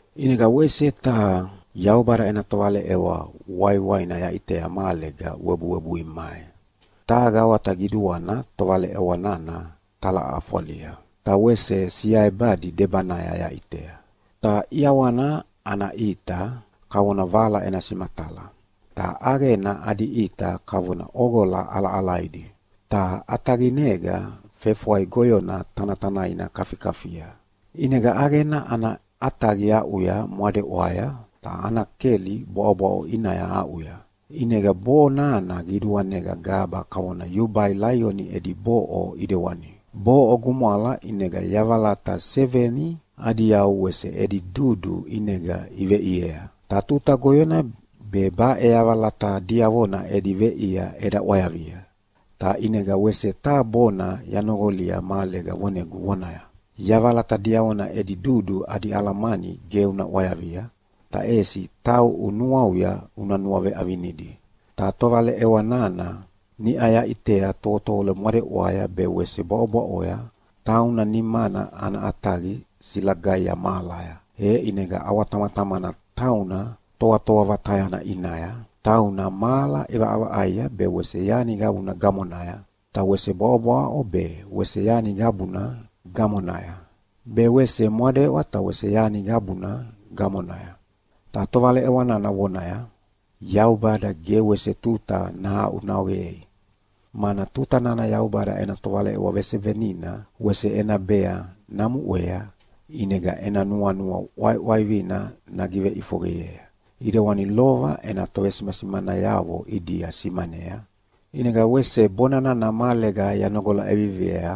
ʼInega wese taha Yaubada ena tovaleʼewa waiwaina yaʼitea mahalega webuwebui mai. Taha gawata qiduana tovaleʼewa nana talaʼafwalia, ta wese siaebadi debanaya yaʼitea. Ta ʼiawana ana ʼita kavona vala ena simatala, ta ʼaqena adi ʼita kavona ʼoqola ʼalaʼalaidi. Ta ʼataqinega fefwai goyona tanatanaina kafikafia. ʼInega ʼaqena ana ʼataqi aʼuya mwadeʼwaya, ta ana keli bwaʼobwaʼo ʼinaya aʼuya. ʼInega bonana qiduanega gaba kavona yubai laioni edi boʼo ʼidewani. Boʼo gumwala ʼinega yavalata seveni adi yau wese edi dudu ʼinega iveʼiea. Tuta goyona be baʼe yavalata diavona edi veʼia eda ʼwayavia, ta ʼinega wese taha bona yanoqolia mahalega vonegu vonaya, “Yavalata diavona edi dudu adi alamani ge una ʼwayavia, ta ʼesi tauʼu nuauya una nuaveʼavinidi!” Ta tovaleʼewa nana niʼa yaʼitea tovotovolo mwadeʼwaya be wese bwaʼobwaʼoya, tauna nimana ana ʼataqi silagaia mahalaya, e ʼinega ʼawatamatamana tauna Toatoa Vatayana ʼinaya, tauna mahala ʼivaʼavaʼaia be wese yani qabuna gamonaya, ta wese bwaʼobwaʼo be wese yani qabuna gamonaya, be wese mwadeʼwa ta wese yani qabuna gamonaya. Ta tovaleʼewa nana vonaya, “Yaubada ge wese tuta nahaʼunaqoyei, mana tuta nana Yaubada ena tovaleʼewa vesevenina wese ena bea namuʼea, ʼinega ena nuanua ʼwaiʼwaivina nagiveʼifoqeyea, ʼidewani lova ena tovesimasimanayavo ʼidia simanea.” ʼInega wese bona nana mahalega yanoqola ʼeviviea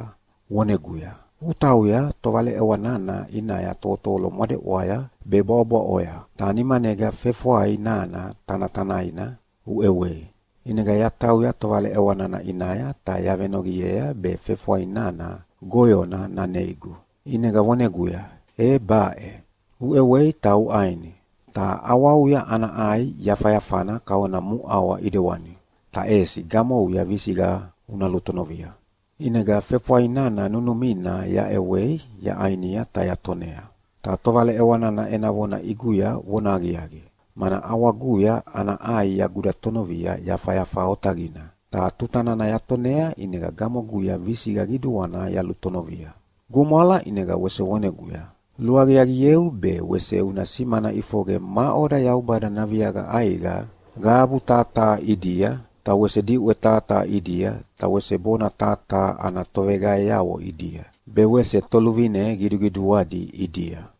voneguya, “Utauya tovaleʼewa nana ʼinaya tovotovolo mwadeʼwaya be bwaʼobwaʼoya, ta nimanega fefwai nana tanatanaina uʼewei!” ʼInega yatauya tovaleʼewa nana ʼinaya ta yavenoqiea be fefwai nana goyona naneigu. ʼInega voneguya, “E baʼe, uʼewei ta uʼaini. Ta ʼawauya ana ʼai yafayafana kavona muʼawa ʼidewani, ta ʼesi gamouya visiqa una lutonovia.” ʼInega fefwai nana nunumina yaʼewei yaʼainia ta yatonea. Ta tovaleʼewa nana ena vona ʼiguya vonahaqiaqi, mana ʼawaguya ana ʼai yagudatonovia yafayafa otaqina, ta tuta nana yatonea ʼinega gamoguya visiqa qiduana yalutonovia. Gumwala, ʼinega wese voneguya, “Luaqiaqieu be wese una simana ʼifoqe maʼoda Yaubada naviaqa ʼaiqa qabu taha taha ʼidia, ta wese diʼwe taha taha ʼidia, ta wese bona taha taha ana toveqaeavo ʼidia, be wese toluvine qiduqiduadi ʼidia.”